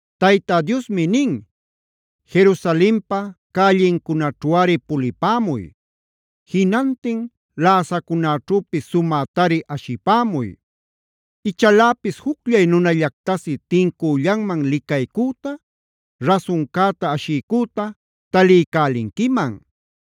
Tayta Diosmi nin: “Jerusalenpa cällincunaćhuꞌari pulipämuy. Jinantin läsacunäćhüpis sumätari ashipämuy. Ichaläpis jucllay nunallactasi tincüllanman licaycüta, rasuncäta ashiycüta taliycälinquiman.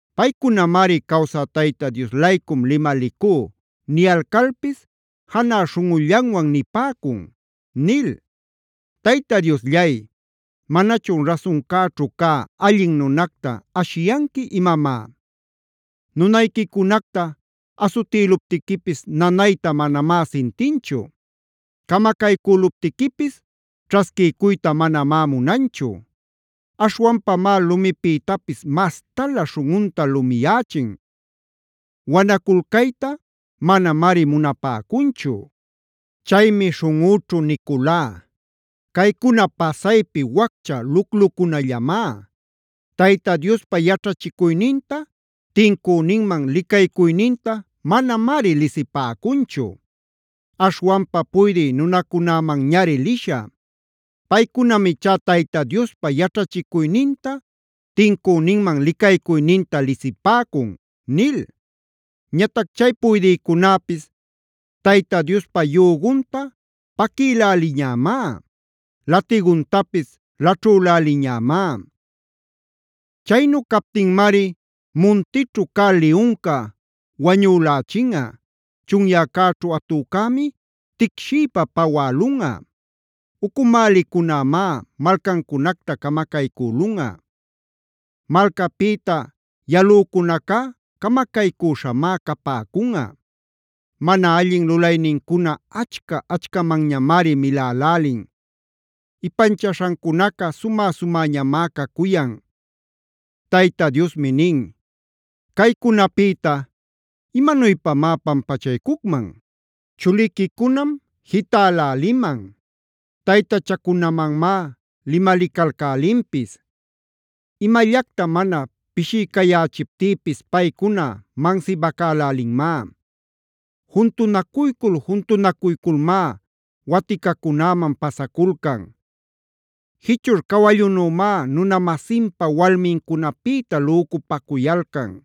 Paycunamari ‘Cawsä Tayta Dios-laycum limalicú’ niyalcalpis janä śhunꞌullanwan nipäcun” nil. Tayta Diosllay, ¿manachun rasuncäćhu cä allin nunacta ashiyanqui imamá? Nunayquicunacta asutïluptiquipis nanayta manamá sintinchu. Camacaycüluptiquipis ćhasquicuyta manamá munanchu. Aśhwanpamá lumipïtapis mastalä śhunꞌunta lumiyächin. Wanaculcayta manamari munapäcunchu. Chaymi śhunꞌüćhu niculá: “Caycuna pasaypi waccha luclucunallamá. Tayta Diospa yaćhachicuyninta, tincüninman licaycuyninta manamari lisipäcunchu. Aśhwanpa puydï nunacunämanñari lishä; paycunam ichá Tayta Diospa yaćhachicuyninta, tincüninman licaycuyninta lisipäcun” nil. Ñatac chay puydïcunäpis Tayta Diospa yügunta paquïläliñämá; lätiguntapis laćhüläliñämá. Chaynu captinmari muntićhu cä liyunca wañülächinꞌa; chunyäcäćhu atücämi ticshiypa pawälunꞌa; ucumälicunämá malcancunacta camacaycülunꞌa. Malcapïta yalücunacá camacaycüśhamá capäcunꞌa. Mana allin lulaynincuna achca-achcamanñamari milälälin; ipanchaśhancunaca sumä-sumäñamá cacuyan. Tayta Diosmi nin: “Caycunapïta ¿imanuypamá pampachaycucman? Chuliquicunam jitäläliman; taytachacunamanmá limalicalcälinpis. Imallacta mana pishiycayächiptïpis paycuna mansibacälälinmá; juntunacuycul-juntunacuyculmá waticacunäman pasaculcan. Jichurb cawallunümá nuna-masinpa walmincunapïta lücupacuyalcan.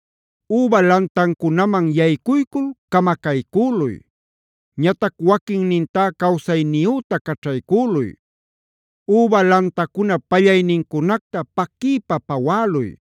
“Üba lantancunaman yaycuycul camacaycüluy, ñatac waquinnintá cawsayniyüta caćhaycüluy. Üba lantacunap pallaynincunacta paquiypa pawäluy;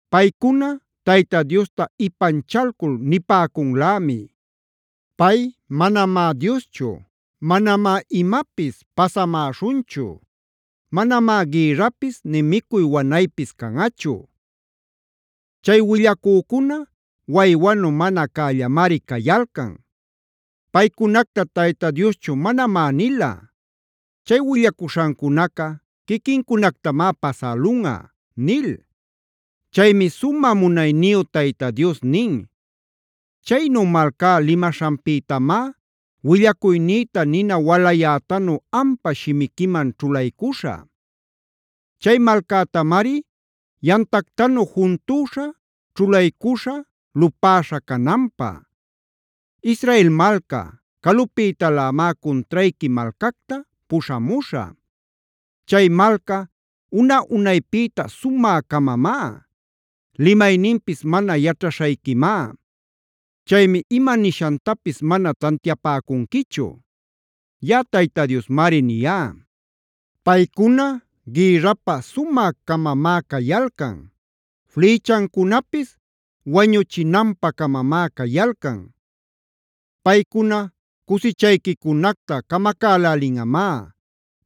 Paycuna Tayta Diosta ipanchalcul nipäcunlämi: “Pay manamá Dioschu. Manamá imapis pasamäśhunchu; manamá gïrrapis nï micuy wanaypis canꞌachu. Chay willacücuna waywanu mana cällamari cayalcan. Paycunacta Tayta Dioschu manamá nila. Chay willacuśhancunaca quiquincunactamá pasälunꞌa” nil. Chaymi sumä munayniyu Tayta Dios nin: “Chaynu malcá limaśhanpïtamá, willacuynïta nina walayätanu ampa shimiquiman ćhulaycuśhä. Chay malcätamari yamtactanu juntüśha, ćhulaycuśhä lupäśha cananpä. Israel malca, calupïtalämá cuntrayqui malcacta puśhamuśhä; chay malca una-unaypïta sumä-camamá. Limayninpis mana yaćhaśhayquimá. Chaymi ima nishantapis mana tantiapäcunquichu.d Yaꞌa Tayta Diosmari niyá. Paycuna gïrrapä sumä-camamá cayalcan; flïchancunapis wañuchinanpä-camamá cayalcan. Paycuna cusichayquicunacta camacälälinꞌamá;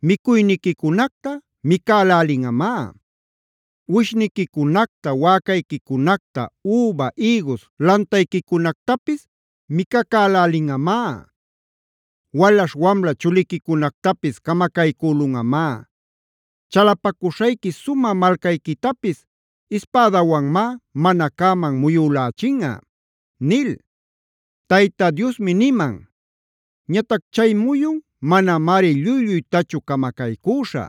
micuyniquicunacta micälälinꞌamá; uwishniquicunacta, wäcayquicunacta, üba, ïgus lantayquicunactapis micacälälinꞌamá. Walaśh wamla chuliquicunactapis camacaycülunꞌamá. Chalapacuśhayqui sumä malcayquitapis ispädawanmá mana cäman muyülächinꞌa” nil. Tayta Diosmi niman: “Ñatac chay muyun manamari lluy-lluytachu camacaycüśhä.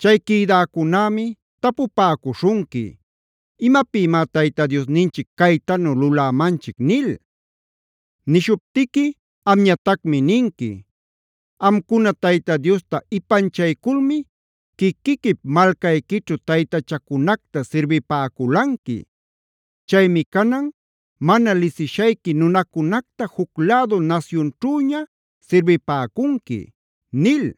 Chay quïdäcunämi tapupäcuśhunqui: ‘¿Imapïmá Tayta Diosninchic caytanu lulämanchic?’ nil. Nishuptiqui amñatacmi ninqui: ‘Amcuna Tayta Diosta ipanchayculmi quiquiquip malcayquićhu taytachacunacta sirbipäculanqui. Chaymi canan, mana lisishayqui nunacunacta juc lädu nasyunćhüña sirbipäcunqui’” nil.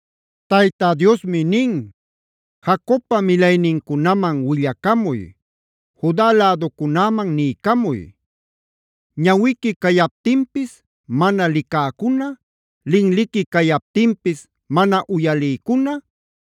Tayta Diosmi nin: “Jacobpa milaynincunaman willacamuy; Juda läducunäman niycamuy: ‘Ñawiqui cayaptinpis mana licäcuna, linliqui cayaptinpis mana uyalïcuna,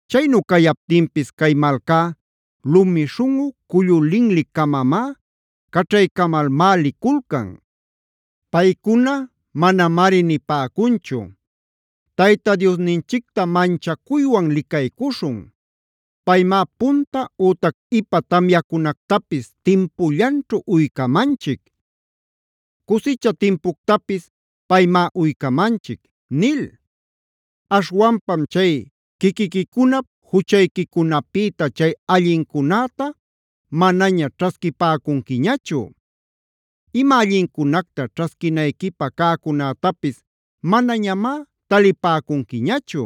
“ ‘Chaynu cayaptinpis cay malcá lumi śhunꞌu, cullu linli-camamá; caćhaycamalmá liculcan. Paycuna manamari nipäcunchu: “Tayta Diosninchicta manchacuywan licaycuśhun. Paymá punta ütac ipa tamyacunactapis timpullanćhu uycamanchic; cusicha timpuctapis paymá uycamanchic” nil. Aśhwanpam chay quiquiquicunap juchayquicunapïta chay allincunäta manaña ćhasquipäcunquiñachu. Ima allincunacta ćhasquinayquipä cäcunätapis manañamá talipäcunquiñachu.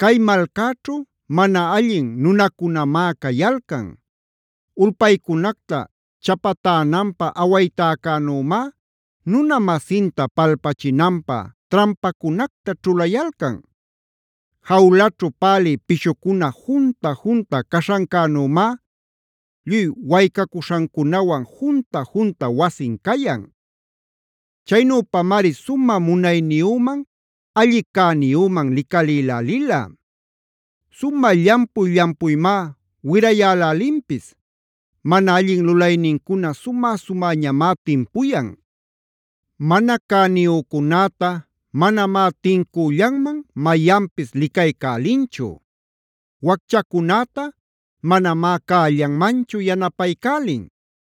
“ ‘Cay malcäćhu mana allin nunacunamá cayalcan; ulpaycunacta chapatänanpä awaytäcänümá nuna-masinta palpachinanpä trampacunacta ćhulayalcan. Jawlaćhu pälï pishucuna junta-junta caśhancänümá, lluy waycacuśhancunawan junta-junta wasin cayan. Chaynüpamari sumä munayniyüman alli cäniyüman licalïlälila. Sumä llampuy-llampuymá wirayälälinpis. Mana allin lulaynincuna sumä-sumäñamá timpuyan. Mana cäniyücunäta manamá tincüllanman mayanpis licaycälinchu. Wacchacunäta manamá cällanmanchu yanapaycälin.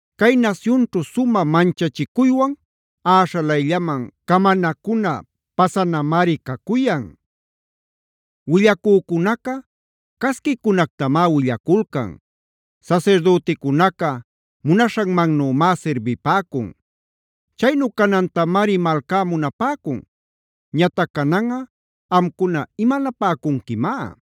Cay nasyunćhu sumä manchachicuywan äśhalayllaman camanacuna pasanamari cacuyan. Willacücunaca casquicunactamá willaculcan; sasirdüticunaca munaśhanmannümá sirbipäcun. Chaynu canantamari malcá munapäcun. Ñatac cananꞌa amcuna ¿imanapäcunquimá?